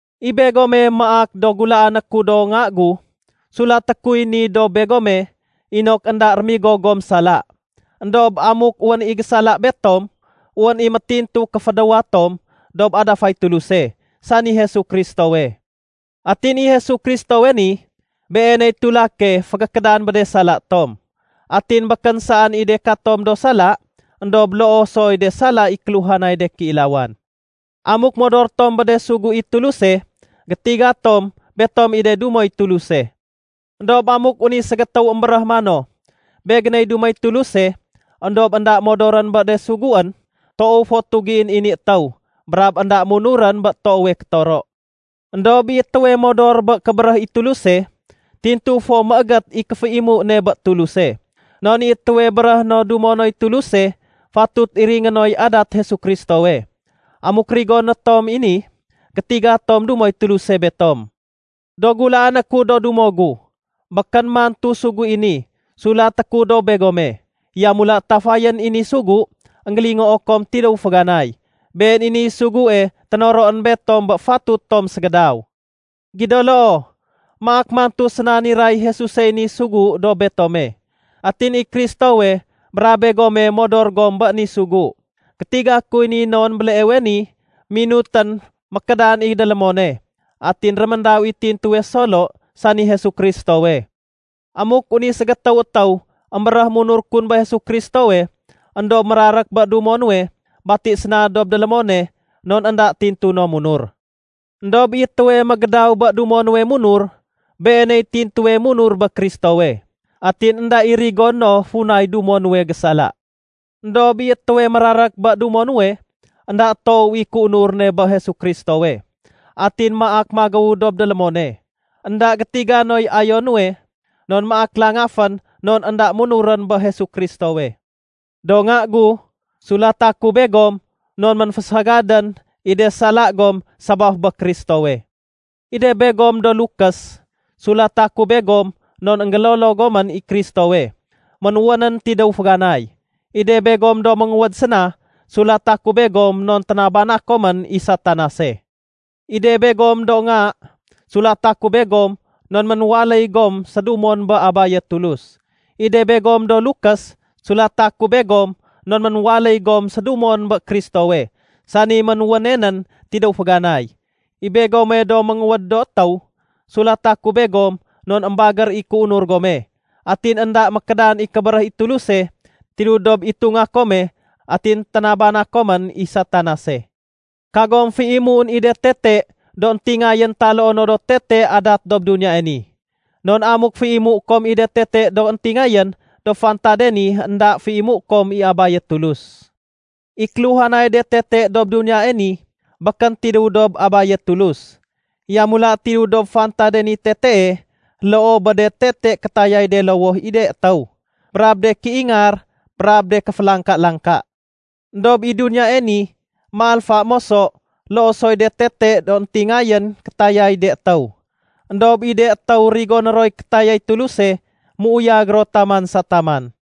I begome maak do gulaané ku do nga gu, sulaté kuy ni dob begome inok énda rémigo gom sala. Endob amuk wén i gésala betom, wén i métintuwe kéfédéwa tom dob adafay Tuluse, sani Jesu Kristowe. Atin i Jesu Kristowe ni, Beeney tulake fégékédan bé de sala tom. Atin békén saén i de katom do sala, éndob loo soy de sala i kéluhanay de kéilawan. Amuk modor tom bé de sugu i Tuluse, gétiga tom betom i de dumoy Tuluse. Endob amuk wén i ségétéw émbéréh mano, “Begéney dumoy Tuluse”, éndob énda modorén bé de suguén, toow fo tugién i ni étéw brab énda munurén bé toowe kétoro. Endob i étéwe modor bé kébéréh i Tuluse, tintu fo méégét i kéféimu ne bé Tuluse. Non i étéwe béréhé no dumo noy Tuluse, fatut iringé noy adat Jesu Kristowe. Amuk rigoné tom i ni, gétiga tom dumoy Tuluse betom. Do gulaané ku do dumo gu, békén mantu sugu i ni sulaté ku dob begome. Yamula tafayén i ni sugu énggélingoo kom tidéw féganay. Been i niy sugue ténoroén betom bé fatut tom ségédaw. Gido loo, maak mantu séna niray Jesusey ni sugu dob betome. Atin i Kristowe brab begome modor gom bé ni sugu. Gétiga kuy ni non béleewe ni minutén mékédan i délémone atin réméndaw i tintuwe solo, sani Jesu Kristowe. Amuk wén i ségétéw étéw émbéréh munur kun bé Jesu Kristowe, éndob mérarék bé dumo nuwe, bati séna dob délémone, non énda tintu no munur. Endob i étéwe mégédaw bé dumo nuwe munur, beeney tintuwe munur bé Kristowe. Atin énda i rigoné no funay dumo nuwe gésala. Endob i étéwe mérarék bé dumo nuwe, énda toow i kéunur ne bé Jesu Kristowe atin maak magéw dob délémone. Enda gétiga noy ayo nuwe non maak langafén non énda munurén bé Jesu Kristowe. Do nga gu, sulata ku begom non ménfésagadén i de sala gom sabaf bé Kristowe. I de begom do lukés, sulata ku begom non énggélolo gomén i Kristowe ménwénén tidéw féganay. I de begom do ménguwéd séna, sulata ku begom non ténabana komén i Satanase. I de begom do nga, sulata ku begom non ménwaléy gom sédumon bé Abaye Tulus. I de begom do lukés, sulata ku begom non ménwaléy gom sédumon bé Kristowe, sani ménwéne nén tidéw féganay. I begome do ménguwéd do étéw, sulata ku begom non émbagér i kéunur gome, atin énda mékédan i kébéréh i Tuluse tidéw dob itunga kome, atin ténabana komén i Satanase. Kagom féimuén i de tete do éntingayén taloo no do tete adat dob duniyae ni. Non amuk féimué kom i de tete do éntingayén dob fantade ni, énda féimué kom i Abaye Tuluse. I kéluhanay de tete dob duniyae ni, békén tidéw dob Abaye Tulus. Yamula tidéw dob fantade niy tetee loo bé de tete kétayay de lowoh i de étéw, brab de kéingar, brab de kéfélangka-langka. Endob i duniyae ni, méalfa moso, loo soy de tete do éntingayén kétayay de étéw. Endob i de étéw rigoné roy kétayay Tuluse, méuyag ro taman sa taman.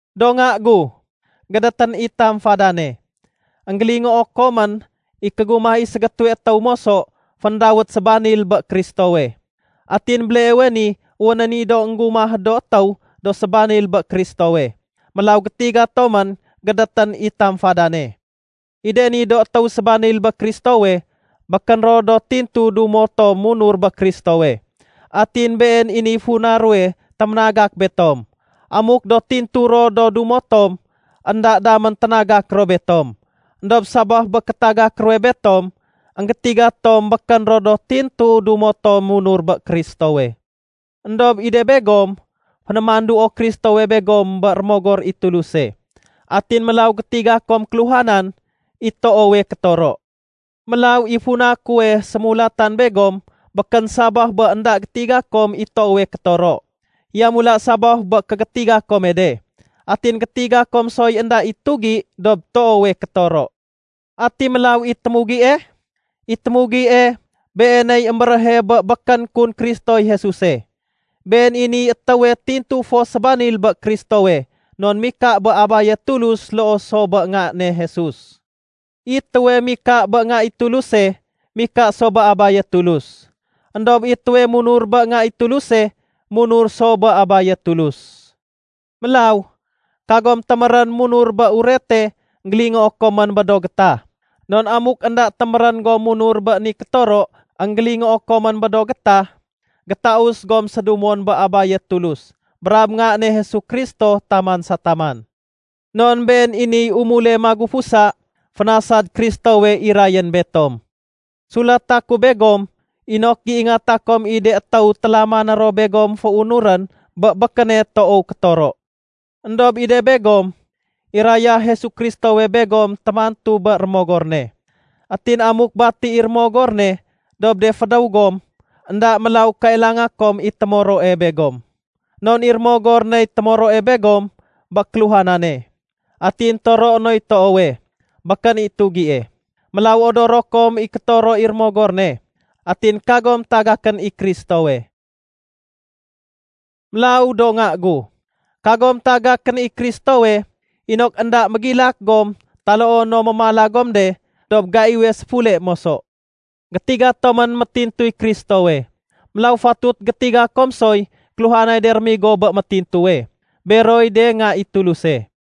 Do nga gu, gédétén i tamfadane. Enggélingoo komén i kégumah i ségétéwe étéw moso féndawét “Sébanil bé Kristowe”. Atin béleewe ni wénén i do énggumah do étéw do sébanil bé Kristowe. Mélaw gétiga tomén gédétén i tamfadane. I de ni do étéw sébanil bé Kristowe, békén ro do tintu dumo tom munur bé Kristowe. Atin been i niy funa ruwe téménagak betom. Amuk do tintu ro do dumo tom, énda damén ténagak ro betom. Endob sabaf bé kétagak ruwe betom, énggétiga tom békén ro do tintu dumo tom munur bé Kristowe. Endob i de begom, fénémanduo Kristowe begom bé Rémogor i Tuluse. Atin mélaw gétiga kom kéluhanan i toowe kétoro. Mélaw i funa kuwe sémulatan begom békén sabaf bé énda gétiga kom i toowe kétoro. Yamula sabaf bé kégétiga kome de, atin gétiga kom soy énda i tugi dob toowe kétoro. Ati mélaw i témugie? I témugie, beeney émbéréhe bé békén kun Kristoy Jesuse. Been i niy étéwe tintu fo sébanil bé Kristowe non mika bé Abaye Tulus loo so bé Nga ne Jesus. I étéwe mika bé Nga i Tuluse, mika so bé Abaye Tulus. Endob i étéwe munur bé Nga i Tuluse, munur so bé Abaye Tulus. Mélaw, kagom témérén munur bé Urete énggélingoo komén bé do gétah. Non amuk énda témérén gom munur bé ni kétoro énggélingoo komén bé do gétah, gétaus gom sédumon bé Abaye Tulus brab Nga ne Jesu Kristo taman sa taman. Non been i niy umule magufusa fénasad Kristowe irayén betom. Sulata ku begom inok géingata kom i de étéw télamané ro begom féunurén bé békéne toow kétoro. Endob i de begom, iraya Jesu Kristowe begom témantu bé Rémogor ne. Atin amuk bati i Rémogor ne dob de fédéw gom, énda mélaw kailanga kom i témoroe begom. Non i Rémogor ney témoroe begom bé kéluhanane. Atin toroe noy toowe, békén i tugie. Mélaw odoro kom i kétoro i Rémogor ne, atin kagom tagakén i Kristowe. Mélaw do nga gu, kagom tagakén i Kristowe inok énda mégilak gom taloo no mémala gom de dob gaiwe séfule moso. Gétiga tomén métintuy Kristowe. Mélaw fatut gétiga kom soy kéluhanay de rémigo bé métintuwe, beroy de nga i Tuluse.